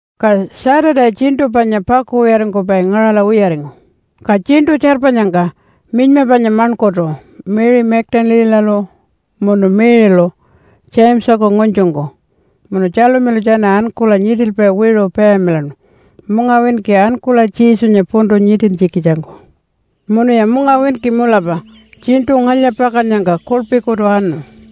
Ka Saturday tjiṉṯu panya pakuwiyaringkupai ngaṟala wiyaringu, ka tjiṉṯu tjarpanyangka minyma panya maṉkurtu Mary Magdalene-alu munu Mary-lu Jamesaku ngunytjungku, munu Tjalumilu tjana ankula nyiṯilpai wiṟu payamilaṉu mungawinki ankula Jesunya puntu nyiṯintjikitjangku. Munuya mungawinki mulapa tjiṉṯu ngalya-pakannyangka kuḻpikutu anu.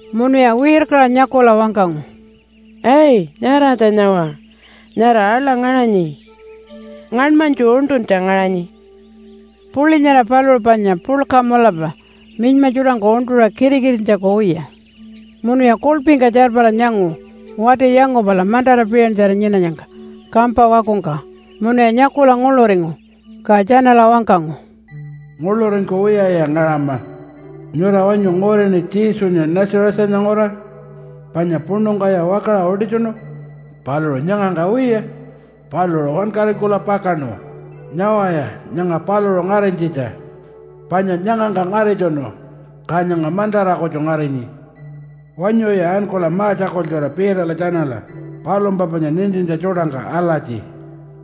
Munuya wirkaṟa nyakula wangkangu, “Ai, nyaratja nyawa, nyara aḻa ngaṟanyi. Ngaṉmanytju uṉṯuntja ngaṟanyi.” Puḻi nyara paluṟu panya puḻka mulapa minyma tjuṯangku uṉṯuṟa kitikitintjaku wiya. Munuya kuḻpingka tjarpara nyangu wati yangupala mantara piṟantjara nyinanyangka kampa wakungka munuya nyakula nguḻuringu. Ka tjanala wangkangu, “Nguḻuringkuwiyaya ngaṟama. Nyura wanyu ngurini Jesunya Nazarethanya nguraṟa panya puṉungkaya wakaṟa utitjunu? Paluṟu nyangangka wiya. Paluṟu wankaringkula pakaṉu. Nyawaya nyanga paluṟu ngarinytjitja, panya nyangangka ngaritjunu ka nyanga mantara kutju ngarinyi. Wanyuya ankula ma-tjakultjura Peterla tjanala palumpa panya nintintja tjuṯangka alatji,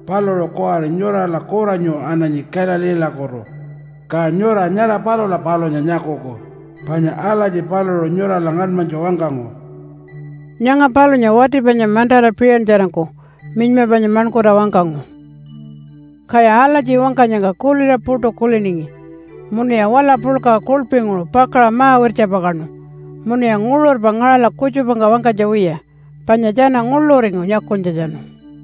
‘Paluṟu kuwari nyurala kuranyu ananyi Galileelakutu, ka nyura nyara palula palunya nyakuku panya alatji paluṟu nyurala ngaṉmanytju wangkangu.’” Nyanga palunya wati panya mantara piṟantjarangku minyma panya maṉkurta wangkangu. Kaya alatji wangkanyangka kuliṟa puṯu kuliningi munuya wala puḻka kuḻpinguṟu pakaṟa ma-wirtjapakaṉu. Munuya nguṟurpa ngaṟala kutjupangka wangkanytja wiya, panya tjana nguḻuringu nyakunytjatjanu.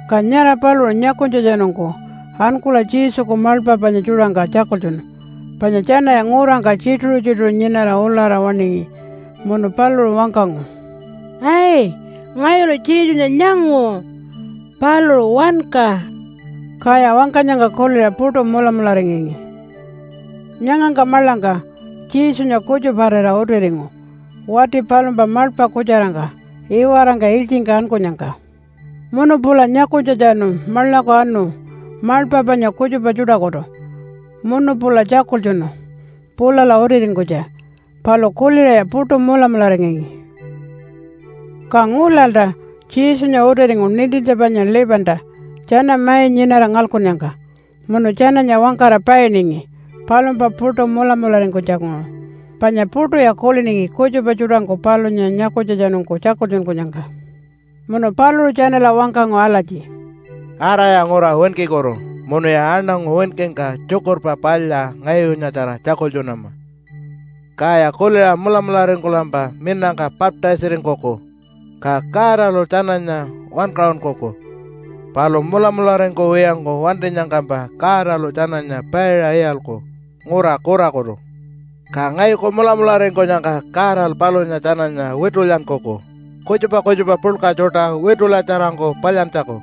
Ka nyara paluṟu nyakunytjatjanungku ankula Jesuku maḻpa panya tjuṯangka tjakultjunu, panya tjanaya ngurangka tjituṟu-tjituṟu nyinara ulara waṉingi. Munu paluṟu wangkangu, “Ai! Ngayulu Jesunya nyangu. Paluṟu wanka.” Kaya wangkanyangka kuliṟa puṯu mulamularingangi. Nyangangka maḻangka Jesunya kutjuparira utiringu wati palumpa maḻpa kutjarangka iwarangka ilytjingka ankunyangka. Munu pula nyakunytjatjanu maḻaku anu maḻpa panya kutjupa tjuṯakutu munu pula tjakultjunu pulala utiringkunytja. Palu kuliṟaya puṯu mulamularingangi. Ka ngulalta Jesunya utiringu nintintja panya 11-ta tjana mai nyinara ngalkunnyangka. Munu tjananya wangkara painingi palumpa puṯu mulamularingkunytjanguṟu, panya puṯuya kuliningi kutjupa tjuṯangku palunya nyakunytjatjanungku tjakultjunkunyangka. Munu paluṟu tjanala wangkangu alatji, “Araya ngura winkikutu munuya aṉangu winkingka Tjukurpa Palya ngayunyatjara tjakultjunama. Kaya kuliṟa mulamularingkulampa minangka baptise-aringkuku, ka Godalu tjananya wankaṟunkuku. Palu mulamularingkuwiyangku wantinyangkampa Godalu tjananya paiṟa iyalku ngura kurakutu. Ka ngayuku mulamularingkunyangka Godalu palunya tjananya witulyankuku, kutjupa kutjupa puḻka tjuṯa witulyatjarangku palyantjaku.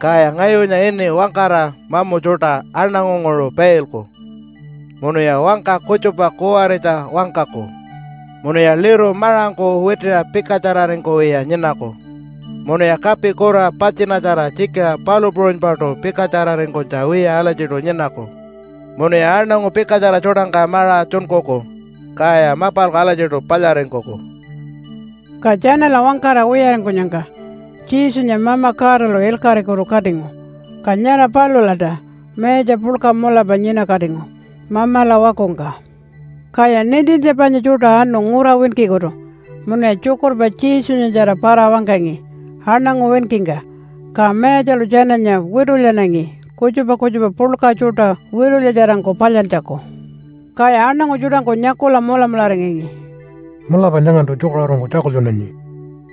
Kaya ngayunya ini wangkara mamu tjuṯa aṉangunguṟu pailku, munuya wangka kutjupa kuwaritja wangkaku. Munuya liru maṟangku witiṟa pikatjararingkuwiya nyinaku, munuya kapi kura patjinatjara tjikiṟa palu puṟunypaṯu pikatjararingkunytja wiya alatjiṯu nyinaku. Munuya aṉangu pikatjara tjuṯangka maṟa tjunkuku, kaya mapalku alatjiṯu palyaringkuku.” Ka tjanala wangkara wiyaringkunyangka Jesunya Mama Godalu ilkaṟikutu katingu, ka nyara palulalta mayatja puḻka mulapa nyinakatingu Mamala wakungka. Kaya nintintja panya tjuṯa anu ngura winkikutu munuya tjukurpa Jesunyatjara para-wangkangi aṉangu winkingka. Ka Mayatjalu tjananya witulyanangi kutjupa kutjupa puḻka tjuṯa witulyatjarangku palyantjaku. Kaya aṉangu tjuṯangku nyakula mulamularingangi, “Mulapa nyangantu tjukaṟurungku tjakultjunanyi.”